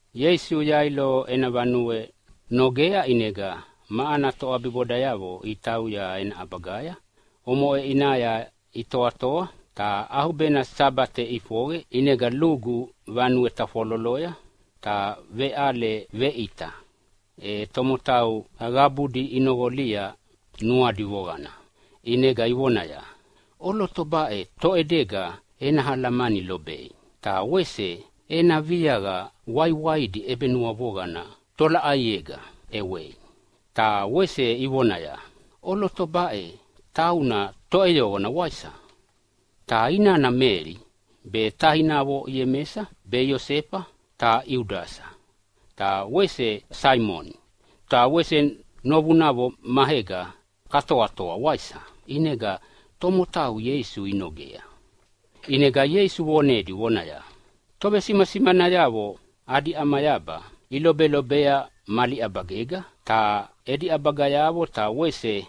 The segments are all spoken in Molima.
Ieisu Yailo ena vanue nogea, ʼinega ma ana toʼabibodayavo itauya ena ʼabagaya. Omoʼe ʼinaya itoatoa ta ʼaubena Sabate ʼifoqe. ʼInega lugu vanue tafwaloloya ta veʼale veʼita, e tomotau qabudi inoqolia nuadi voqana, ʼinega ivonaya, “ʼOloto baʼe, toʼedega ena alamani lobei ta wese ena viaqa waiwaidi ʼebenuavoqana tolaʼaiega ʼewei?” Ta wese ivonaya, “ʼOloto baʼe, tauna toʼeyoqona, waisa? Ta inana Meli be tainavo Iemesa be Iosefa be Iudasa ta wese Saimoni. Ta wese novunavo maega katoatoa, waisa?” ʼInega tomotau Ieisu inogea. ʼInega Ieisu vonedi vonaya, “Tovesimasimanayavo adi ʼamayaba ilobelobea mali ʼabagega, ta edi ʼabagayavo ta wese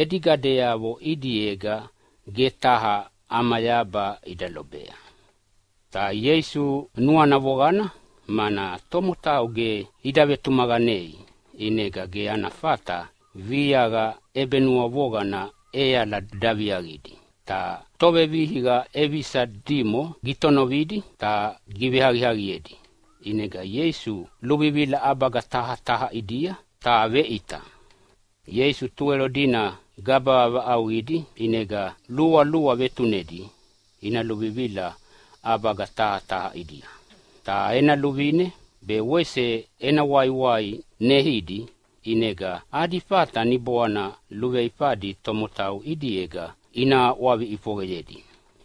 edi gadeavo ʼidiega ge taha ʼamayaba ida lobea.” Ta Ieisu nuana voqana mana tomotau ge ida vetumaqanea. ʼInega ge ana fata viaqa ʼebenuavoqana ʼeala daviaqidi, ta tovevihiqa ʼevisa dimo gitonovidi ta giveaqiaqiedi. ʼInega Ieisu luvivila ʼabaga taha taha ʼidia ta veveʼita. Ieisu Tuwelo dina gaba vaʼauqidi, ʼinega lualua vetunedi ina luvivila ʼabaga taha taha ʼidia. Ta ena luvine be wese ena waiwai neidi, ʼinega adi fata niboana luveifadi tomotau ʼidiega ina ʼwavi ʼifoqeyedi.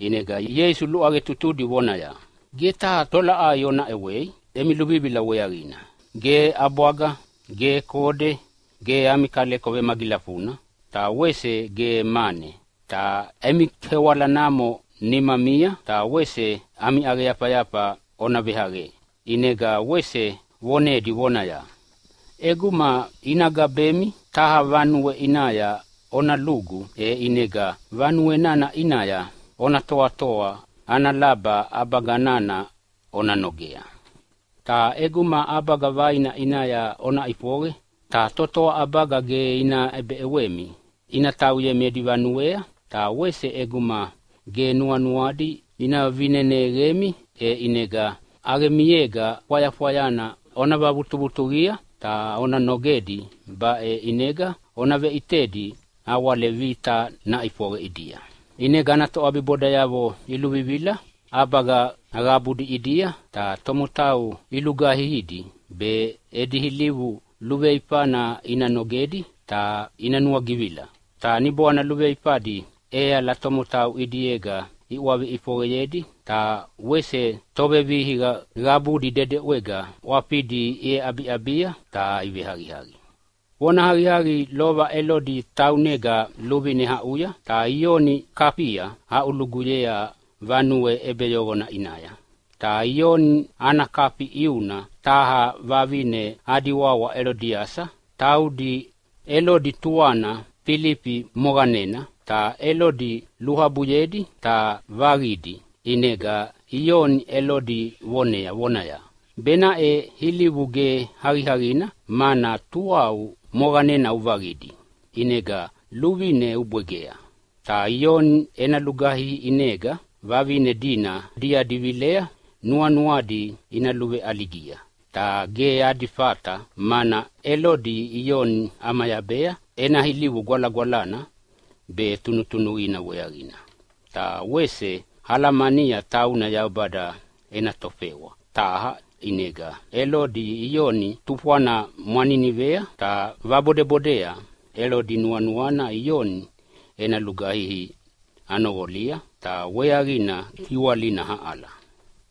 ʼInega Ieisu luʼaqetutudi vonaya, “Ge taha tolaʼai ona ʼewei emi luvivila weaqina. Ge ʼabwaga, ge kode, ge ami kaleko vemagilafuna, ta wese ge mane. Ta emi kewala namo nimamia ta wese ami ʼaqeyafayafa ona veʼaqe.” ʼInega wese vonedi vonaya, “ʼEguma ina gabemi taha vanue ʼinaya ona lugu, e ʼinega vanue nana ʼinaya ona toatoa ana laba ʼabaga nana ona nogea. Ta ʼeguma ʼabaga vaina ʼinaya ona ʼifoqe ta totoa ʼabaga ge ina ʼebeʼewemi ina tauyemi edi vanuea, ta wese ʼeguma ge nuanuadi ina vineneqemi, e ʼinega ʼaqemiega fwayafwaya ona vavutuvutuqia, ta ona nogedi. Baʼe ʼinega ona veʼitedi nawale vita naʼifoqe ʼidia.” ʼInega ana toʼabibodayavo iluvivila ʼabaga qabudi ʼidia ta tomotau ilugaihidi be edi ilivu luveifana ina nogedi ta ina nuagivila. Ta niboana luveifadi ʼeala tomotau ʼidiega iʼwavi ʼifoqeyedi, ta wese tovevihiqa qabudi dedeʼwega ʼwafidi iʼeʼabiʼabia ta iveaqiaqi. Vonahaqiaqi, lova Elodi taunega luvine aʼuya ta Ioni ikafia iaʼuluguyea vanue ʼebeyoqona ʼinaya. Ta Ioni ana kafi ʼiuna taha vavine adi wawa Elodiasa. Taudi Elodi tuana Filifi moqanena, ta Elodi luabuyedi ta vaqidi. ʼInega Ioni Elodi vonea vonaya, “Benaʼe ilivu ge aqiaqina, mana tuau moqanena uvaqidi, ʼinega luvine ubwegea.” Ta Ioni ena lugaihi ʼinega vavine dina diadi vilea nuanuadi ina luveʼaligia. Ta ge adi fata, mana Elodi Ioni ʼamayabea ena ilivu gwalagwalana be tunutunuqina weaqina. Ta wese alamania tauna Yaubada ena tofewa taha. ʼInega Elodi Ioni tufwana mwaninivea ta vabodebodea. Elodi nuanuana Ioni ena lugaihi nanoqolia, ta weaqina giwalina aʼala.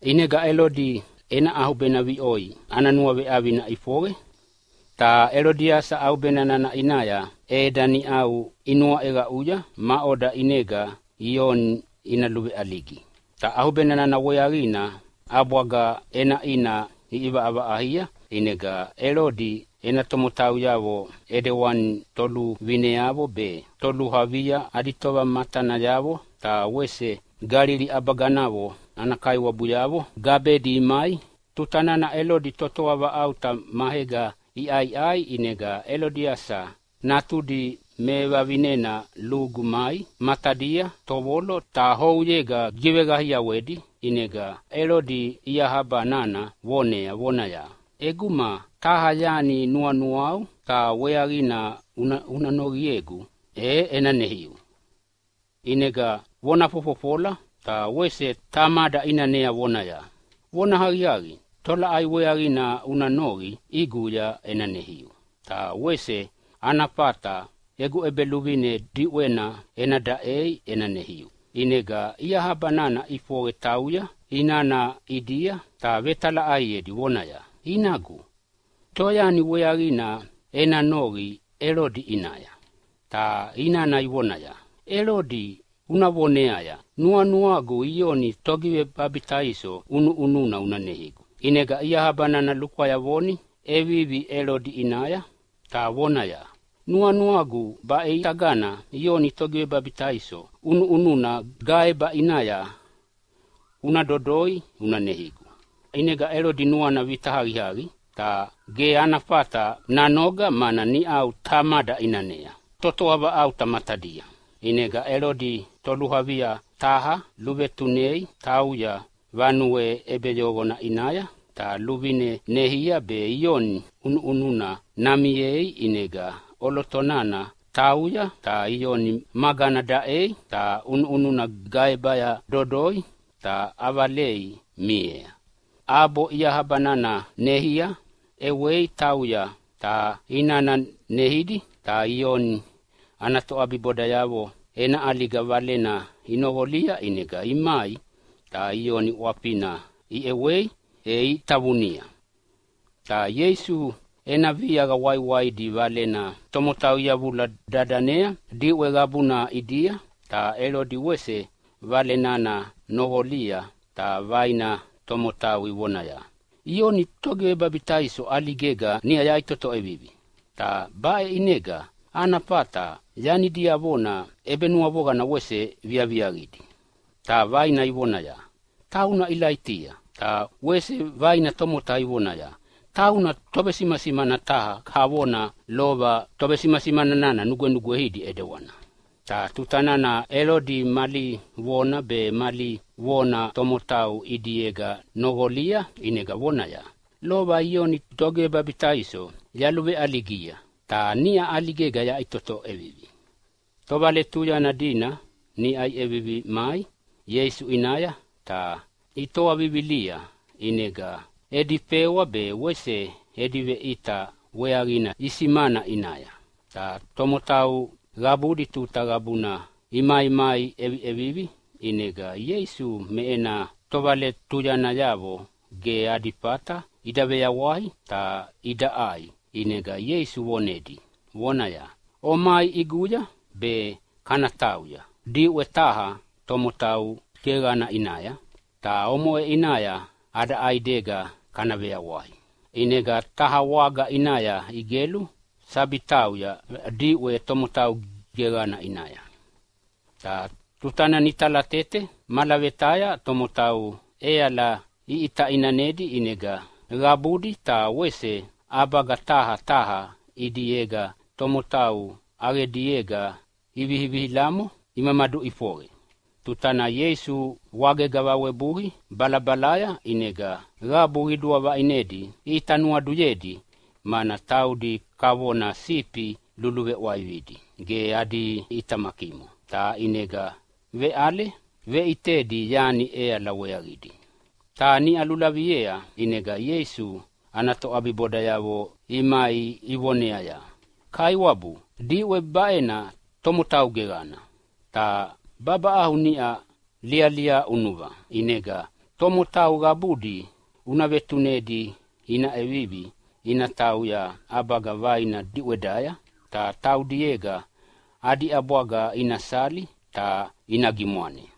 ʼInega Elodi ena ʼaubena viʼoi ana nuaveʼavina ʼifoqe. Ta Elodiasa ʼaubenana ʼinaya ʼeda niʼau inuaʼeqaʼuya maʼoda ʼinega Ioni ina luveʼaligi. Ta ʼaubena nana weaqina ʼabwaga ʼenaʼina iʼivaʼavaʼaia. ʼInega Elodi ena tomotauyavo ʼidewani toluvineavo be toluavia adi tovamatanayavo ta wese Galili ʼabaganavo ana kaiwabuyavo gabedi imai. Tuta nana Elodi totoa vaʼauta maega iʼaiʼai, ʼinega Elodiasa natudi mevavinena lugu mai matadia tovolo, ta ouyega gigiveqaiawedi. ʼInega Elodi iahaba nana vonea vonaya, “ʼEguma taha yani nuanuau ta weaqina una noqiegu, e ena neiu.” ʼInega vona fofofola ta wese Tamada ʼinanea vonaya, “Vonahaqiaqi, tolaʼai weaqina una noqi ʼiguya ena neiu, ta wese ana fata egu ʼebeluvine diʼwena ena daʼei ena neiu!” ʼInega iahaba nana ʼifoqe tauya inana ʼidia ta vetalaʼaiedi vonaya, “Inagu, toyani weaqina ena noqi Elodi ʼinaya?” Ta inana ivonaya, “Elodi una voneaya, ‘Nuanuagu Ioni Togivebabitaiso ʼunuʼununa una neigu.’” ʼInega iahabana lukwayavoni ʼevivi Elodi ʼinaya ta vonaya, “Nuanuagu baʼitaga Ioni Togivebabitaiso ʼunuʼununa gaeba ʼinaya una dodoi una neigu.” ʼInega Elodi nuana vita aqiaqi ta ge ana fata nanoga mana niʼau Tamada ʼinanea totoa vaʼauta matadia. ʼInega Elodi toluavia taha luvetunei natauya vanue ʼebeyoqona ʼinaya, ta luvine neia be Ioni ʼunuʼununa namiea. ʼInega ʼoloto nana tauya ta Ioni magana daʼea, ta ʼunuʼununa gaebaya dodoi ta ʼavalei miea ʼabo iahaba nana neia. ʼEwei tauya ta inana neidi. Ta Ioni ana toʼabibodayavo ena ʼaliga valena inoqolia, ʼinega imai ta Ioni ʼwafina iʼewei e itavunia. Ta Ieisu ena viaqa waiwaidi valena tomotau iyavula dadanea diʼwe qabuna ʼidia, ta Elodi wese vale nana noqolia. Ta vaina tomotau ivonaya, “Ioni Togivebabitaiso ʼaligega niʼa yaʼitoto ʼevivi, ta baʼe ʼinega ana fata yani diavona ʼebenua voqana wese viaviaqidi.” Ta vaina ivonaya, “Tauna Ilaitia.” Ta wese vaina tomotau ivonaya, “Tauna tovesimasimana taha kavona lova tovesimasimana nugwenugweidi ʼidewana.” Ta tuta nana Elodi mali vona be mali vona tomotau ʼidiega noqolia ʼinega vonaya, “Lova Ioni Togivebabitaiso yaluveʼaligia, ta niʼa ʼaligega yaʼitoto ʼevivi.” Tovaletuyana dina niʼau iʼevivi mai Ieisu ʼinaya ta itoa vivilia. ʼInega edi fewa be wese edi veʼita weaqina isimana ʼinaya. Ta tomotau qabudi tuta qabuna imaimai ʼeviʼevivi. ʼInega Ieisu me ena tovaletuyanayavo ge adi fata ida veyawai ta ida ʼai. ʼInega Ieisu vonedi vonaya, “Omai ʼiguya, be kana tauya diʼwe taha tomotau geqana ʼinaya, ta omoʼe ʼinaya ada ʼaidega kana veyawai.” ʼInega taha waga ʼinaya igelu sabi tauya diʼwe tomotau geqana ʼinaya. Ta tuta nana italatete malavetaya tomotau ʼeala iʼita ʼinanedi. ʼInega qabudi ta wese ʼabaga taha taha ʼidiega tomotau ʼaqediega ivihilamo imaduʼifoqe. Tuta nana Ieisu wagega vawebui balabalaya ʼinega qabu qidua vaʼinedi ʼita nuaduyedi, mana taudi kavona sifi luluveʼwaividi ge adi toʼitamakimo. Ta ʼinega veʼale veʼitedi yani ʼeala weaqidi. Ta niʼa lulaviea ʼinega Ieisu ana toʼabibodayavo imai ivoneaya, “Kaiwabu, diʼwe baʼena tomotau geqana ta babaʼau niʼau lialia ʼunuva. ʼInega tomotau qabudi una vetunedi ina ʼevivi ina tauya ʼabaga vaina diʼwedaya, ta taudiega adi ʼabwaga ina sali ta ina gimwane.”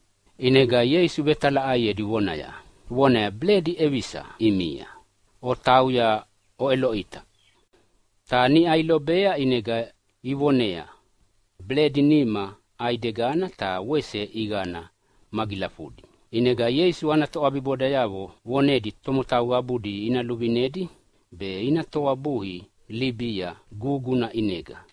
ʼInega Ieisu vetalaʼaiedi vonaya, “Beledi ʼevisa ʼimia? Otauya oʼeloʼita.” Ta niʼa ilobea ʼinega ivoneaya, “Beledi nima ʼaidegana ta wese ʼiqana magilafudi.” ʼInega Ieisu ana toʼabibodayavo vonedi tomotau qabudi ina luvinedi be ina toabui libia guguna ʼinega.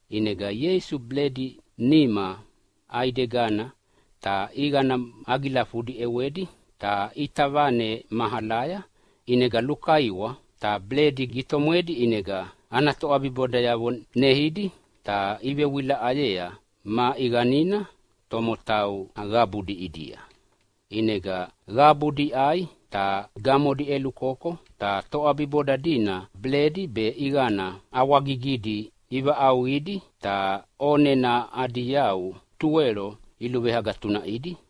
ʼInega Ieisu beledi nima ʼaidegana ta ʼiqana magilafudi ʼewedi ta ʼita vane mahalaya ʼinega lukaiwa ta beledi gitomwedi. ʼInega ana toʼabibodayavo neidi, ta ivewilaʼayea ma ʼiqanina tomotau qabudi ʼidia. ʼInega qabudi iʼai ta gamodi ʼelukoko. Ta toʼabiboda dina beledi be ʼiqana ʼawagigidi ivaʼauqidi ta ʼonena adi yau tuwelo iluveagatunaʼidi.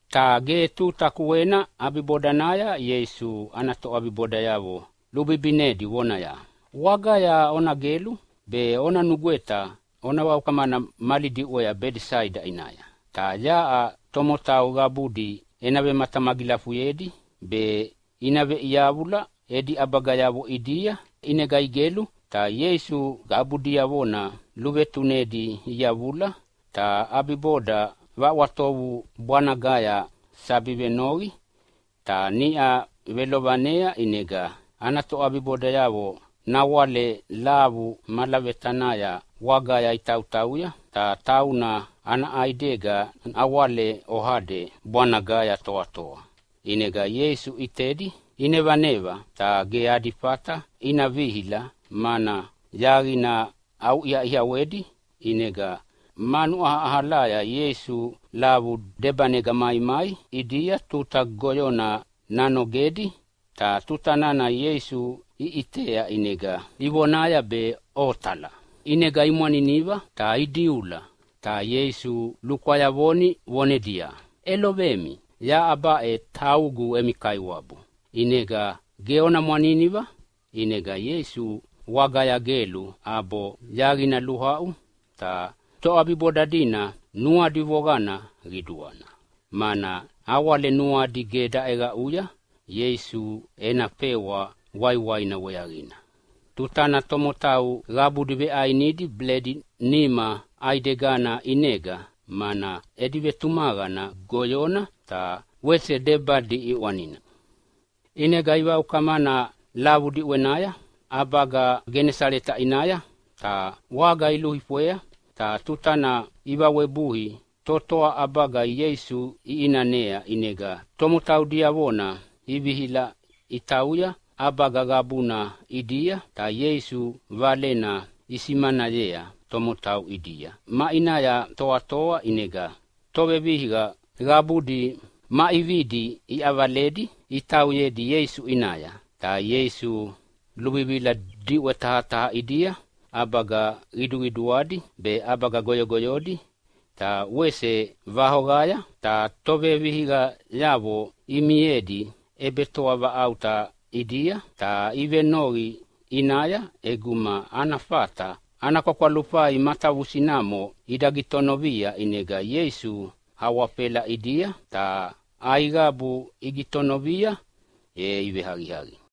Ta ge tuta kuena ʼabibodanaya Ieisu ana toʼabibodayavo lubibinedi vonaya, “Wagaya ona gelu be ona nugweta ona vaukamana mali diʼwea Bedesaida ʼinaya. Ta yaʼa tomotau qabudi ena vematamagilafuyedi be ina veʼiyavula edi ʼabagayavo ʼidia.” ʼInega igelu ta Ieisu qabu diavona luvetunedi iyavula, ta ʼabiboda ʼwatovu bwanagaya sabi venoqi. Ta niʼa velovanea ʼinega ana toʼabibodayavo nawale lavu malavetanaya wagaya itautauya, ta tauna ana ʼaidega nawale oade bwanagaya toatoa. ʼInega Ieisu ʼitedi inevaneva ta ge adi fata ina vihila, mana yaqina ʼauʼiaʼiawedi. ʼInega manu ʼaʼalaya Ieisu lavu debanega maimai ʼidia tuta goyona nanogedi. Ta tuta nana Ieisu iʼitea ʼinega ivonaya be otala. ʼInega imwaniniva ta idiula, ta Ieisu lukwayavoni vonedia, “ʼElovemi, yaʼa baʼe taugu emi Kaiwabu, ʼinega ge ona mwaniniva!” ʼInega Ieisu wagaya gelu ʼabo yaqina luaʼu. Ta toʼabiboda dina nuadi voqana qiduana, mana nawale nuadi ge daʼeqaʼuya Ieisu ena fewa waiwaina weaqina tuta nana tomotau qabudi veʼainidi beledi nima ʼaidegana ʼinega, mana edi vetumaqana goyona ta wese debadi ʼiʼwanina. ʼInega ivaukamana lavu diʼwenaya ʼabaga Genasaleta ʼinaya, ta waga iluifwea. Ta tutana ivawebui totoa ʼabaga Ieisu iʼinanea. ʼInega tomotau diavona ivihila itauya ʼabaga qabuna ʼidia, ta Ieisu Valena isimanayea tomotau ʼidia maʼinaya toatoa. ʼInega tovevihiqa qabudi ma ʼividi iʼavaledi itauyedi Ieisu ʼinaya. Ta Ieisu luvivila diʼwe taha taha ʼidia, ʼabaga qiduqiduadi be ʼabaga goyogoyodi, ta wese vaoqaya. Ta tovevihiqayavo imiedi ʼebetoavaʼauta ʼidia, ta ivenoqi ʼinaya ʼeguma ana fata ana kwakwalufai matavusinamo ida gitonovia. ʼInega Ieisu awafela ʼidia, ta aiqabu igitonovia e iveaqiaqi.